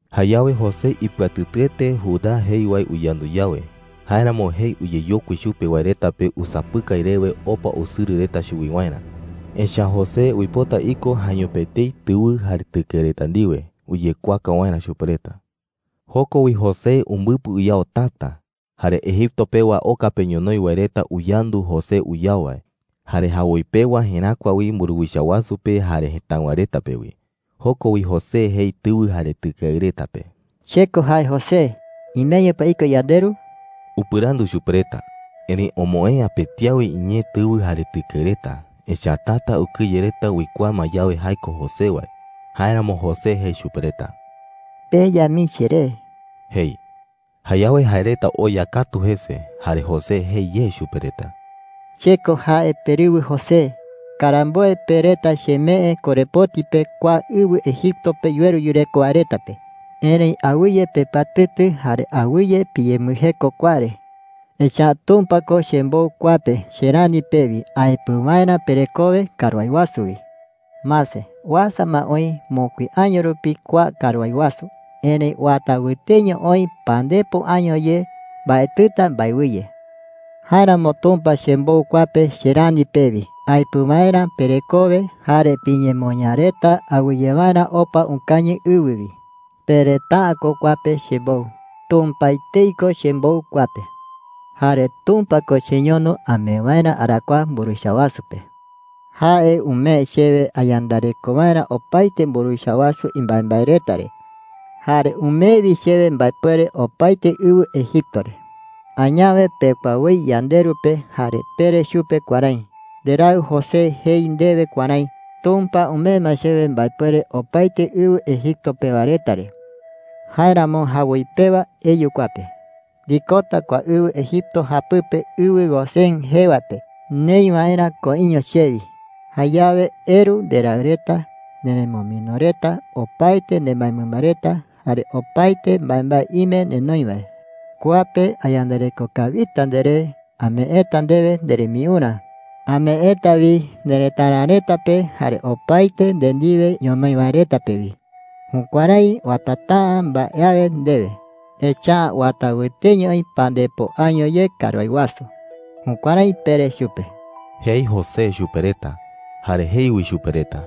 Jayawe José ipɨatɨtɨete Judá jei wae uyandu yawe. Jáeramo jei uyeyokui chupe wae reta pe usapɨkai rewe opa usɨrɨ reta chuwi waerä. Echa’ä José uipota iko jaeño pe etei tɨwɨ jare tɨkeɨ reta ndiwe uyekuaaka waerä chupe reta. Joko wi José umbɨpɨ uyao täta. Jare Egipto pewa oka pe ñonoï wae reta uyandu José uyao wae. Jare jawoi pewa jeräkua wi mburuwicha wasu pe jare jëtáɨwa reta pe wi. Joko wi José jei tɨwɨ jare tɨkeɨ reta pe: “¡Che ko jae José! ¿Imeño pa iko yanderu?” upɨrandu chupe reta. Erëi omoë'ä pëti awe iñee tɨwɨ jare tɨkeɨ reta, echa’ä täta ukɨye reta uikuaa ma yawe jae ko José wae. Jáeramo José jei chupe reta: “Peya mii cheré,” jei. Jayawe jae reta oya katu jese. Jare José jei ye chupe reta: “Che ko jae perɨwɨ José. Karamboe pe reta chemee korepoti pe kua ɨwɨ Egipto pe yuweru yureko wae reta pe,” jei chupe reta. “Erëi awɨye pepɨatɨtɨ jare awɨye piyembɨjeko kua re, echa’ä Tumpa ko chembou kua pe che rani pewi aepɨ waerä perekowe karuái wasu wi,” jei. “Mase, uasa ma oï mokui año rupi kua karuái wasu. Erëi uata wɨteño oï pandepo año ye mbaetɨta mbaewɨye,” jei. “Jáeramo Tumpa chembou kua pe che rani pewi aepɨ waerä perekowe jare piñemoñaa reta awɨye waerä opa ukañɨ ɨwɨ wi,” jei. “Pe reta’ä ko kua pe chembou. Tumpa etei ko chembou kua pe,” jei. “Jare Tumpa ko cheñono amee waerä arakuaa mburuwicha wasu pe,” jei. “Jae umee chewe ayandareko waerä opaete mburuwicha wasu imbaembae reta re. Jare umee wi chewe mbaepuere opaete ɨwɨ Egipto re,” jei chupe reta. “Añawe pekua woi yanderu pe jare pere chupe kuärái: ‘Nderaɨ José jei ndewe kuärái: Tumpa umee ma chewe mbaepuere opaete ɨwɨ Egipto pewa reta re. Jáeramo jawoi pewa eyu kua pe. Ndikota kua ɨwɨ Egipto japɨpe ɨwɨ Gosén jee wae pe neï waerä koiño chewi. Jayawe eru nderaɨ reta, nerumɨmino reta, opaete nderɨmba reta, jare opaete mbaembae ime nenoi wae. Kua pe ayandareko kawita nderé. Ameeta ndewe nderembiurä. Ameeta wi nerëtara reta pe jare opaete nde ndiwe ñonoï wae reta pe wi. Jukuärái uatata’ä mbae awe ndewe, echa’ä uata wɨteño oï pandepo año ye karuái wasu.’ Jukuärái pere chupe,” jei José chupe reta. Jare jei wi chupe reta: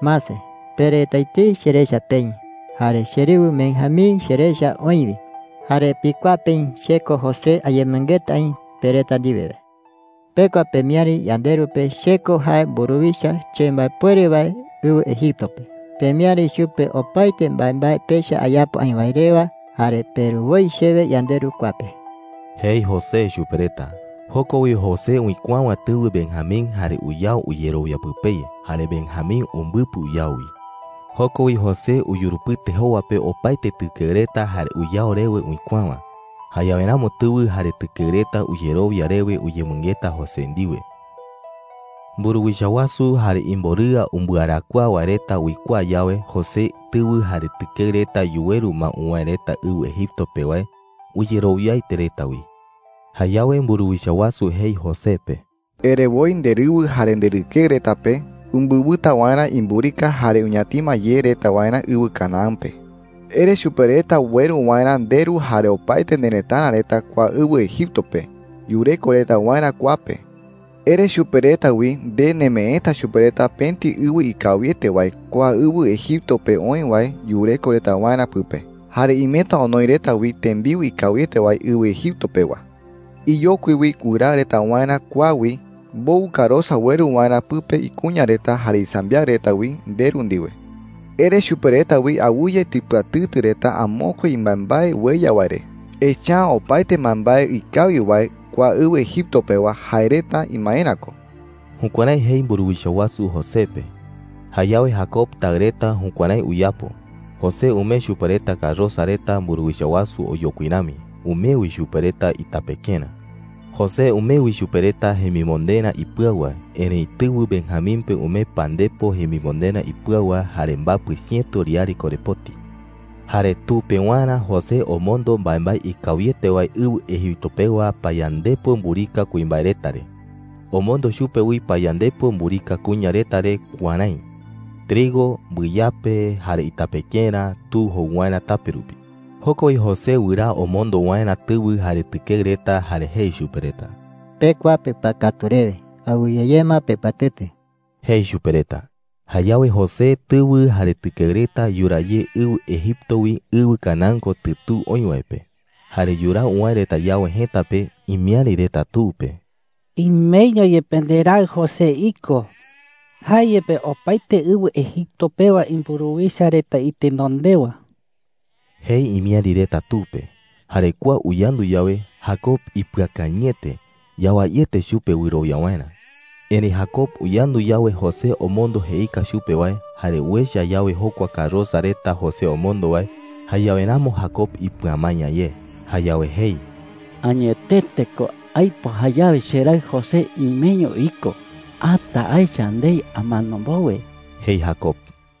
“Mase, pe reta etei cherecha peï, jare cherɨwɨ Benjamín cherecha oï wi. Jare pikuaa peï che ko José ayemɨngeta aï pe reta ndiwe wae. Pekua pemiäri yanderu pe che ko jae mburuwicha chembaepuere wae ɨwɨ Egipto pe. Pemiäri chupe opaete mbaembae pecha ayapo aï wae rewa, jare peru woi chewe yanderu kua pe,” jei José chupe reta. Joko wi José uikuäwa tɨwɨ Benjamín jare uyao uyerowia pɨpei. Jare Benjamín umbɨpɨ uyao wi. Joko wi José uyurupɨte jowa pe opaete tɨkeɨ reta jare uyao rewe uikuäwa. Jayawe ramo tɨwɨ jare tɨkeɨ reta uyerowia rewe uyemɨngeta José ndiwe. Mburuwicha wasu jare imborɨa umbɨarakuaa wae reta uikuaa yawe José tɨwɨ jare tɨkeɨ reta yuweru ma uwäe reta ɨwɨ Egipto pe wae, uyerowiaete reta wi. Jayawe mburuwicha wasu jei José pe: “Ere woi nderɨwɨ jare nderɨkeɨ reta pe umbɨwɨta waerä imburika jare uñatima ye reta waerä ɨwɨ Canaán pe,” jei chupe. “Ere chupe reta ueru waerä nderu jare opaete nerëtara reta kua ɨwɨ Egipto pe yureko reta waerä kua pe. Ere chupe reta wi nde nemeeta chupe reta pëti ɨwɨ ikawiete wae kua ɨwɨ Egipto pe oï wae yureko reta waerä pɨpe. Jare imeta onoi reta wi tembiu ikawiete wae ɨwɨ Egipto pewa,” jei chupe. “Iyokui wi wɨraa reta waerä kua wi mbowɨ karosa ueru waerä pɨpe ikuña reta jare isambiaɨ reta wi nderu ndiwe,” jei chupe. “Ere chupe reta wi awɨye tipɨatɨtɨ reta amokue imbaembae ueya wae re, echa’ä opaete mbaembae ikawi wae kua ɨwɨ Egipto pewa jae reta imaerä ko.” Jukuärái jei mburuwicha wasu José pe. Jayawe Jacob taɨ reta jukuärái uyapo. José umee chupe reta karosa reta mburuwicha wasu oyokui rami. Umee wi chupe reta itapekerä. José umee wi chupe reta jemimonderä ipɨau wae. Erëi tɨwɨ Benjamín pe umee pandepo jemimonderä ipɨau wae jare mbapɨ chiëto riare korepoti. Jare tu pewarä José omondo mbaembae ikawiete wae ɨwɨ Egipto pewa payandepo mburika kuimbae reta re. Omondo chupe wi payandepo mburika kuña reta re kuärái: trigo, mbɨyape, jare itapekerä tu jou waerä tape rupi. Joko wi José wɨraa omondo waerä tɨwɨ jare tɨkeɨ reta, jare jei chupe reta: “Pekua pepɨakatu rewe. Awɨye ye ma pepɨatɨtɨ,” jei chupe reta. Jayawe José tɨwɨ jare tɨkeɨ reta yuraa ye ɨwɨ Egipto wi ɨwɨ Canaán kotɨ tu oï wae pe. Jare yuraa uwäe reta yawe jëta pe, imiäri reta tu pe: “¡Imeño yepe nderaɨ José iko! ¡Jae yepe opaete ɨwɨ Egipto pewa mburuwicha reta itenondewa!” jei imiäri reta tu pe. Jare kua uyandu yawe, Jacob ipɨakañɨete. Yawaiete chupe wɨrowia waerä. Erëi Jacob uyandu yawe José omondo jeika chupe wae, jare uecha yawe jokua karosa reta José omondo wae, jayawe ramo Jacob ipɨamaña ye. Jayawe jei: “¡Añetete ko aipo jayawe cheraɨ José imeño iko! Ata aecha ndei amano mbowe,” jei Jacob.